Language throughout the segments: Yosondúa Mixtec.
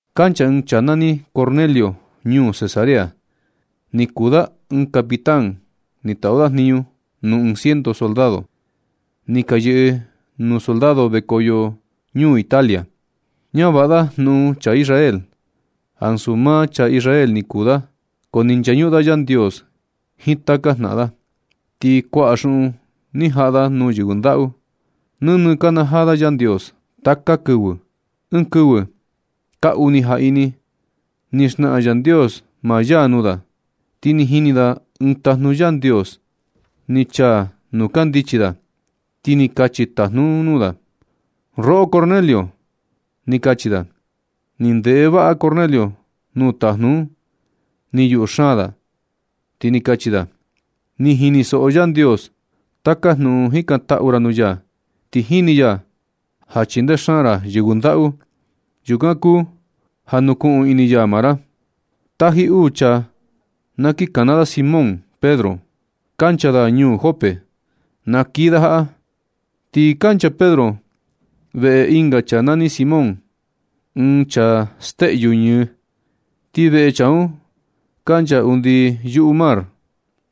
Kancha ɨɨn chaa nani Cornelio ñuu Cesarea. Ni kuu da ɨɨn capitán ni taꞌu da jniñu nuu ɨɨn ciento soldado. Ni ka yɨꞌɨ nuu soldado vekoyo ñuu Italia. Ñavaꞌa da jnuꞌun chaa Israel, ansu maa chaa Israel ni kuu da, ko ni nchañuꞌun da Yandios jiin taka jnaꞌan da. Ti kuaꞌa xuꞌun ni jaꞌa da nuu yɨvɨ ndaꞌu. Nɨnɨ nakanajaa da Yandios taka kɨvɨ. Ɨɨn kɨvɨ kaa uni jaꞌini ni naxnaꞌan Yandios maa ya nuu da, ti ni jini da ɨɨn tajnu Yandios ni chaa nuu kandichi da, ti ni kachi tajnu un nuu da: ―Roꞌo Cornelio ―ni kachi da. Ni ndeꞌe vaꞌa Cornelio nuu tajnu un, ni yuꞌu xaan da, ti ni kachi da: ―Ni jinisoꞌo Yandios taka jnuꞌun jikantaꞌu ra nuu ya, ti jini ya ja chindee xaan ra yɨvɨ ndaꞌu. Yukan kuu ja nukuꞌun ini ya maa ra. Taji uu chaa na kiꞌin kana da Simón Pedro, kancha da ñuu Jope, na kii da jaꞌa. Ti kancha Pedro veꞌe ɨnga chaa nani Simón, ɨɨn chaa steꞌyu ñɨ. Ti veꞌe chaa un kancha undi yuꞌu mar.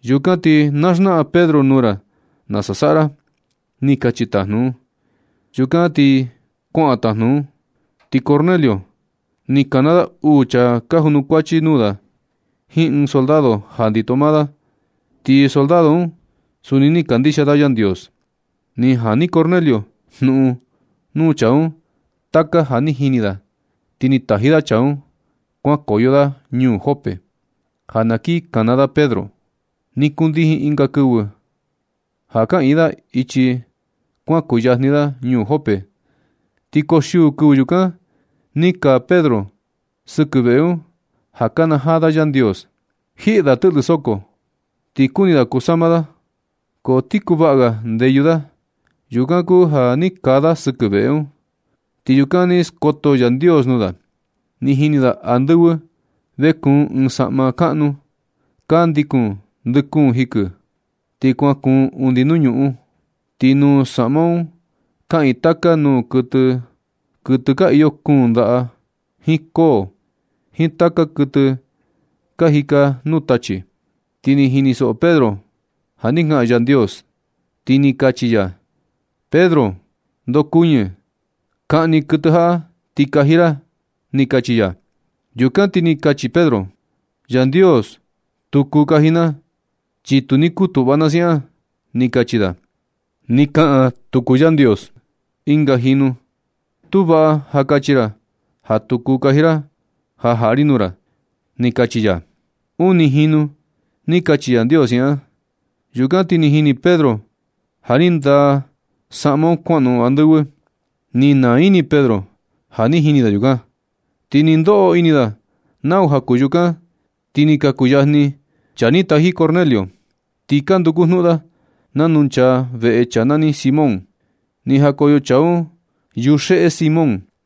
Yukan ti na xnaꞌan Pedro nuu ra nasa saꞌa ra ―ni kachi tajnu un. Yukan ti kuaꞌan tajnu un. Ti Cornelio ni kana da uu chaa ka junukuachi nuu da jiin ɨɨn soldado ja ndito maa da. Ti soldado un suni ni kandixia da Yandios. Ni jani Cornelio jnuꞌun nuu chaa un taka ja ni jini da, ti ni taji da chaa un kuankoyo da ñuu Jope, ja na kin kana da Pedro. Ni kundijin ɨnga kɨvɨ ja kaꞌiin da ichi, kuan kuyajni da ñuu Jope, ti koxiuu kɨvɨ yukan ni kaa Pedro sɨkɨ veꞌe un ja kanajaa da Yandios. Jiꞌi da tɨꞌlɨ soko, ti kuni da kusama da, ko ti kuvaꞌa ga ndeyu da. Yukan kuu ja ni kaa da sɨkɨ veꞌe un, ti yukan ni skoto Yandios nuu da. Ni jini da andɨvɨ vekuun ɨɨn saꞌma kaꞌnu, ka ndikun ndɨ kuun jikɨ, ti kuan kuun undi nuu ñuꞌun. Ti nuu saꞌma un kaꞌiin taka nuu kuɨtɨ, kuɨtɨ ka iyo kuun ndaꞌa, jiin koo, jiin taka kuɨtɨ ka jika nuu tachi. Ti ni jinisoꞌo Pedro ja ni kaꞌan Yandios, ti ni kachi ya: ―Pedro, ndokuɨñi, kaꞌni kuɨtɨ jaꞌa, ti kaji ra ―ni kachi ya. Yukan ti ni kachi Pedro: ―Yandios, tu kuu kaji na, chi tu ni kutuꞌva na siaꞌan ―ni kachi da. Ni kaꞌan tuku Yandios ɨnga jinu: ―Tu vaꞌa ja kachi ra ja tu kuu kaji ra ja jaꞌa ri nuu ra ―ni kachi ya. Uni jinu ni kachi Yandios siaꞌan. Yukan ti ni jini Pedro ja ni ndaa manta un kuanoꞌon andɨvɨ. Ni naa ini Pedro ja ni jini da yukan. Ti nɨ ndoꞌo ini da nau ja kuu yukan, ti ni ka kuyajni chaa ni taji Cornelio. Ti ka nduku jnuꞌun da nanu nchaa veꞌe chaa nani Simón. Ni jakoyo chaa un yuxeꞌe Simón,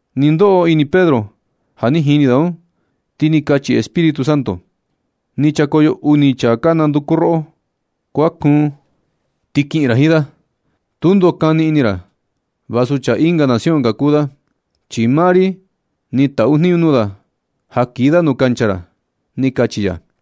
Nɨ ndoꞌo ini Pedro ja ni jini da un, ti ni kachi Espíritu Santo: ―Ni chakoyo uni chaa ka nanduku roꞌo. Kuan kuun, ti kiꞌin ra jiin da. Tundo kani ini ra vasu chaa ɨnga nación ka kuu da, chi maa ri ni taꞌu jniñu nuu da ja kii da nu kancha ra ―ni kachi ya.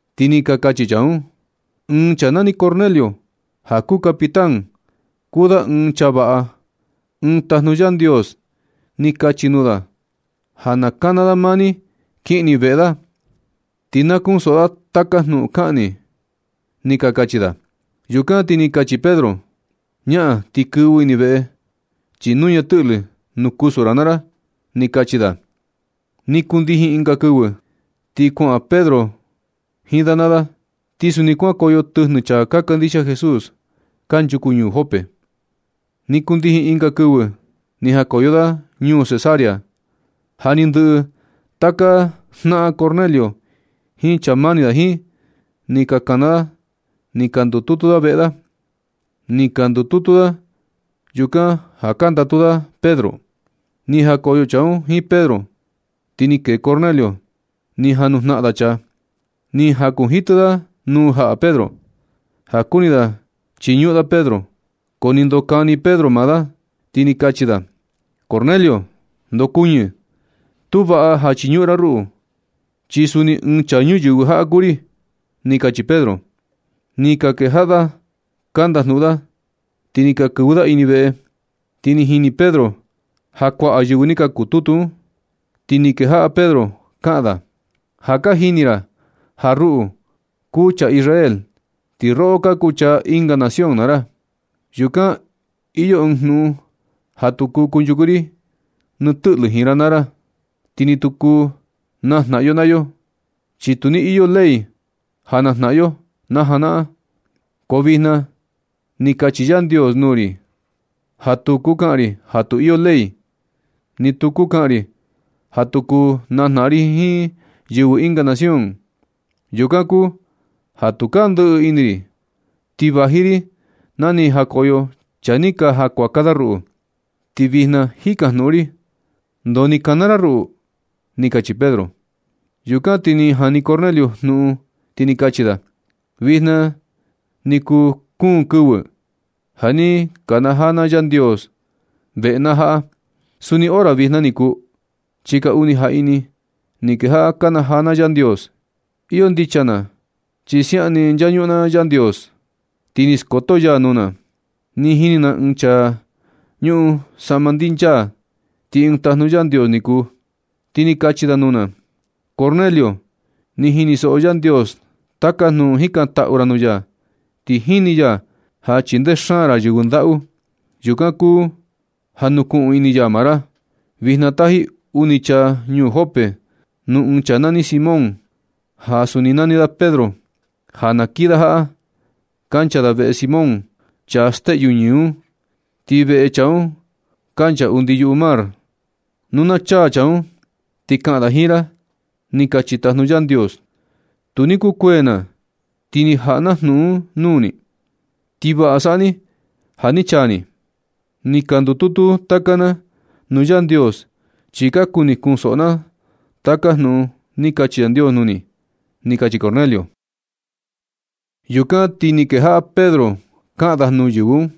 Ti ni ka kachi chaa un: ―Ɨɨn chaa nani Cornelio ja kuu capitán. Kuu da ɨɨn chaa vaꞌa. Ɨɨn tajnu Yandios ni kachi nuu da ja na kana da maa ni kiꞌin ni veꞌe da, ti na kunsoꞌo da taka jnuꞌun kaꞌan ni ―ni ka kachi da. Yukan ti ni kachi Pedro: ―Ñaꞌan ti kɨvɨ ini veꞌe, chi nuña tɨꞌlɨ nuu kusu ra naa ra ―ni kachi da. Ni kundijin ɨnga kɨvɨ, ti kuaꞌan Pedro jiin da naa da. Ti suni kuankoyo tɨjnɨ chaa ka kandixia Jesús kanchuku ñuu Jope. Ni kundijin ɨnga kɨvɨ ni jakoyo da ñuu Cesarea. Ja ni ndɨꞌɨ taka jnaꞌan Cornelio jiin chaa mani da jiin, ni kana da ni ka ndututu veꞌe da. Ni ka ndututu da yukan ja ka ndatu da Pedro. Ni jakoyo chaa un jiin Pedro, ti ni kee Cornelio ni ja nujnaꞌan da chaa, ni jakunjitɨ da nuu jaꞌa Pedro, ja kuni da na Chiñuꞌun da Pedro. Ko ni ndokani Pedro maa da, ti ni kachi da: ―Cornelio, ndokuɨñɨ. Tu vaꞌa ja nachiñuꞌun ra ruꞌu, chi suni ɨɨn chaa ñuyɨvɨ jaꞌa kuu ri ―ni kachi Pedro. Ni ka kejaꞌa da ka ndajnuꞌun da, ni ka kɨvɨ da ini veꞌe, ti ni jini Pedro ja kuaꞌa yɨvɨ ni ka kututu un. Ti ni kejaꞌa Pedro kaꞌan da: ―Ja ka jini ra ja ruꞌu kuu chaa Israel, ti roꞌo ka kuu chaa ɨnga nación naa ra. Yukan iyo ɨɨn jnuꞌun ja tu kuu kunchuku ri ni tɨꞌlɨ jiin ra naa ra, ti ni tu kuu najnaꞌan yo naa yo, chi tu ni iyo ley ja najnaꞌan yo najanaꞌan. Ko vijna ni kachi Yandios nuu ri ja tu kuu kaꞌan ri ja tu iyo ley, ti ni tu kuu kaꞌan ri ja tu kuu najnaꞌan ri jiin yɨvɨ ɨnga nación. Yukan kuu ja tukaa ndɨꞌɨ ini ri, ti vaji ri na ni jakoyo chaa ni ka ja kuaka ruꞌu. Ti vijna jikajnuꞌun ri: ¿Ndoo ni ka kana ra ruꞌu? ―ni kachi Pedro. Yukan ti ni jani Cornelio jnuꞌun, ti ni kachi da: ―Vijna ni kuu kuun kɨvɨ ja ni nakanajaa na Yandios veꞌe na jaꞌa. Suni hora vijna ni kuu, chi kaa uni jaꞌini ni kejaꞌa nakanajaa na Yandios. Iyo ndicha na chi siaꞌan ni nchañuꞌun na Yandios, ti ni skoto ya nuu na. Ni jini na ɨɨn chaa ñuꞌun saꞌma ndinchaa, ti ɨɨn tajnu Yandios ni kuu. Ti ni kachi da nuu na: “Cornelio, ni jinisoꞌo Yandios taka jnuꞌun jikantaꞌu ra nuu ya, ti jini ya ja chindee xaan ra yɨvɨ ndaꞌu. Yukan kuu ja nukuꞌun ini ya maa ra. Vijna taji uni chaa ñuu Jope, nuu ɨɨn chaa nani Simón, ja suni nani da Pedro, ja na kii da jaꞌa. Kancha da veꞌe Simón, chaa steꞌyu ñɨ un. Ti veꞌe chaa un kancha undi yuꞌu mar. Nu na chaa chaa un, ti kaꞌan da jiin ra”, ni kachi tajnu Yandios. Tu ni kukuee na, ti ni jaꞌa na jnuꞌun nuu ni, ti vaꞌa saꞌa ni ja ni chaa ni. Ni ka ndututu taka na nuu Yandios, chi ka kuni kunsoꞌo na taka jnuꞌun ni kachi Yandios nuu ni ―ni kachi Cornelio. Yukan ti ni kejaꞌa Pedro kaꞌan da nuu yɨvɨ un: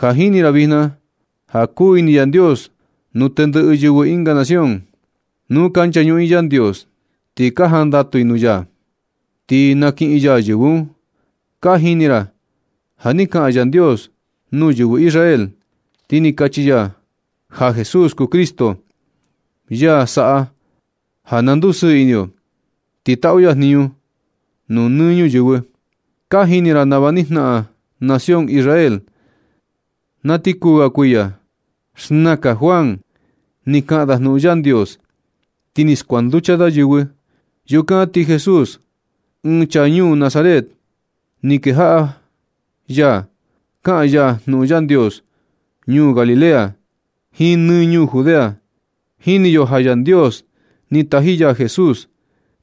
―Ja jini ri vijna ja kuu ini Yandios nuu tendɨꞌɨ yɨvɨ ɨnga nación. Nu ka nchañuꞌun i Yandios, ti ka jandatu i nuu ya, ti nakiꞌin ya yɨvɨ un. Ka jini ra ja ni kaꞌan Yandios nuu yɨvɨ Israel, ti ni kachi ya ja Jesús kuu Cristo, ya saꞌa ja na ndusɨɨ ini yo, ti taꞌu ya jniñu nuu nɨ ñuyɨvɨ. Ka jini ra nava ni jnaꞌan nación Israel na ti kuu ga kuiya. Xnaka Juan ni kaꞌan da jnuꞌun Yandios, ti ni skuanducha da yɨvɨ. Yukan ti Jesús, ɨɨn chaa ñuu Nazaret, ni kejaꞌa ya kaꞌan ya jnuꞌun Yandios ñuu Galilea, jiin nɨ ñuu Judea. Jini yo ja Yandios ni taji ya Jesús,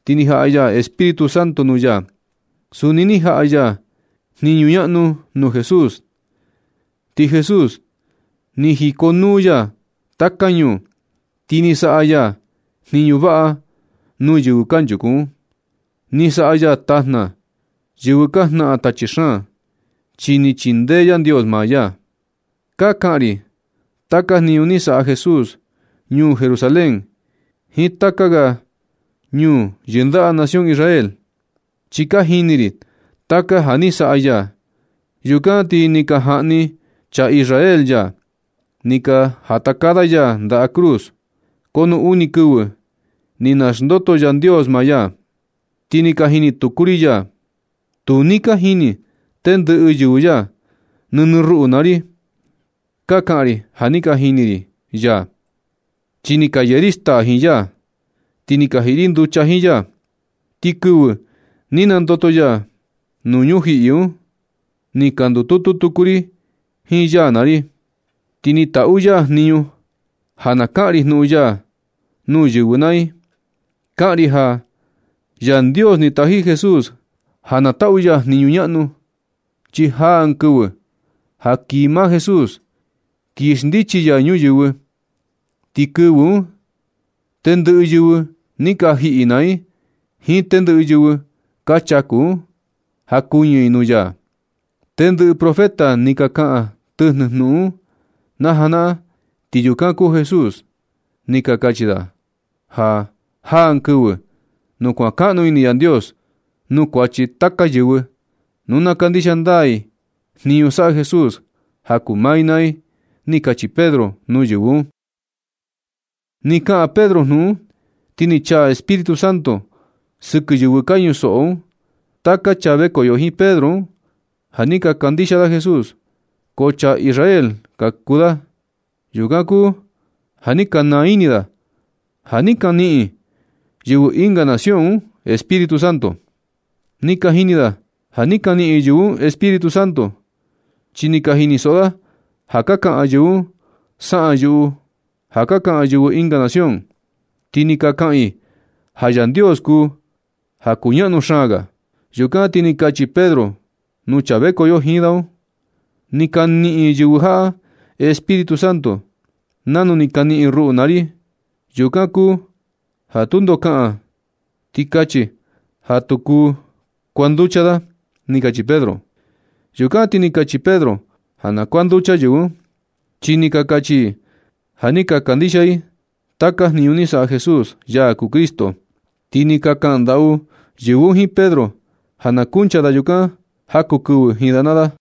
ti ni jaꞌa ya Espíritu Santo nuu ya. Suni ni jaꞌa ya jniñu ñaꞌnu nuu Jesús. Ti Jesús ni jikonuu ya taka ñuu, ti ni saꞌa ya jniñu vaꞌa nuu yɨvɨ kanchuku un. Ni saꞌa ya tajna yɨvɨ ka jnaꞌan tachi xaan, chi ni chindee Yandios maa ya. Ka kaꞌan ri taka jniñu ni saꞌa Jesús ñuu Jerusalén jiin taka ga ñuu yɨndaꞌa nación Israel, chi ni ka jini ri taka ja ni saꞌa ya. Yukan ti ni ka jaꞌni chaa Israel ya, ni ka jatakaa da ya ndaꞌa cruz. Ko nu uni kɨvɨ, ti ni naxndoto Yandios maa ya, ti ni ka jini tuku ri ya. Tu ni ka jini tendɨꞌɨ yɨvɨ ya. Nɨnɨ ruꞌu naa ri. Ka kaꞌan ri ja ni ka jini ri ya, chi ni ka yee ri staa jiin ya, ti ni ka jiꞌi ri nducha jiin ya. Ti kɨvɨ ni nandoto ya nuu ñujiꞌi un, ni ka ndututu tuku ri jiin ya naa ri. Ti ni taꞌu ya jniñu ja na kaꞌan ri jnuꞌun ya nuu yɨvɨ naa i. Kaꞌan ri ja Yandios ni taji Jesús ja na taꞌu ya jniñu ñaꞌnu, chi jaa ɨɨn kɨvɨ ja kii maa Jesús, kii xndichi ya ñuyɨvɨ. Ti kɨvɨ un, tendɨꞌɨ yɨvɨ ni ka jiꞌi naa i, jiin tendɨꞌɨ yɨvɨ ka chaku un, jakuɨñɨ i nuu ya. Tendɨꞌɨ profeta ni ka kaꞌan tɨjnɨ jnuꞌun un najanaꞌan, ti yukan kuu Jesús. Ni ka kachi da ja jaa ɨɨn kɨvɨ nu kuankaꞌnu ini Yandios nuu kuachi taka yɨvɨ, nu na kandixia ndaa i jniñu saꞌa Jesús ja kuu maa i naa i ―ni kachi Pedro nuu yɨvɨ un. Nɨ kaꞌan Pedro jnuꞌun un, ti ni chaa Espíritu Santo sɨkɨ yɨvɨ ka ñusoꞌo un. Taka chaa vekoyo jiin Pedro un ja ni ka kandixia da Jesús, ko chaa Israel ka kuu da. Yukan kuu ja ni ka naa ini da ja ni ka niꞌin yɨvɨ ɨnga nación un Espíritu Santo. Ni ka jini da ja ni ka niꞌin yɨvɨ un Espíritu Santo, chi ni ka jinisoꞌo da ja ka kaꞌan yɨvɨ un saꞌan yuꞌu ja ka kaꞌan yɨvɨ ɨnga nación, ti ka kaꞌan i ja Yandios kuu ja kuñaꞌnu xaan ga. Yukan ti ni kachi Pedro nuu chaa vekoyo jiin da un: ―Ni ka niꞌin yɨvɨ jaꞌa Espíritu Santo nanu ni ka niꞌin ruꞌu naa ri. Yukan kuu ja tundo kaꞌan, ti kachi ja tu kuu kuanducha da ―ni kachi Pedro. Yukan ti ni kachi Pedro ja na kuanducha yɨvɨ un, chi ni ka kachi i ja ni ka kandixia i taka jniñu ni saꞌa Jesús, ya kuu Cristo. Ti ni ka kaꞌan ndaꞌu yɨvɨ un jiin Pedro ja na kuncha da yukan jaku kɨvɨ jiin da naa da.